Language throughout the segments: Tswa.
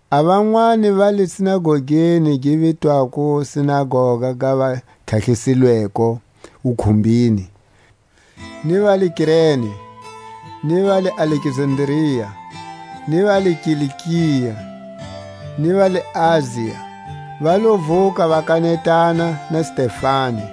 A vanwani va le sinagogeni gi vitwako Sinagoga ga vatlhatlhisilweko wukhumbini, ni va le Kirene, ni va le Alekzandria, ni va le Kilikia, ni va le Asia, va lo vuka va kanetana na Stefani.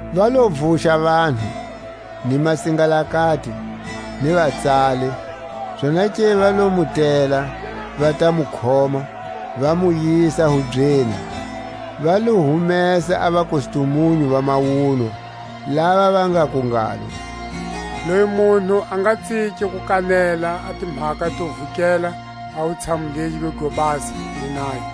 Va lo vuxa vanhu, ni masingalakati, ni vatsali, zonake va lo mu tela, va ta mu khoma, va mu yisa hubyeni. Va lo humesa a vakustumunyu va mawunwa, lava va ngaku ngalo: Loyi munhu a nga tsiki ku kanela a timhaka to vukela a wutshamu legi go basa, ni nayo;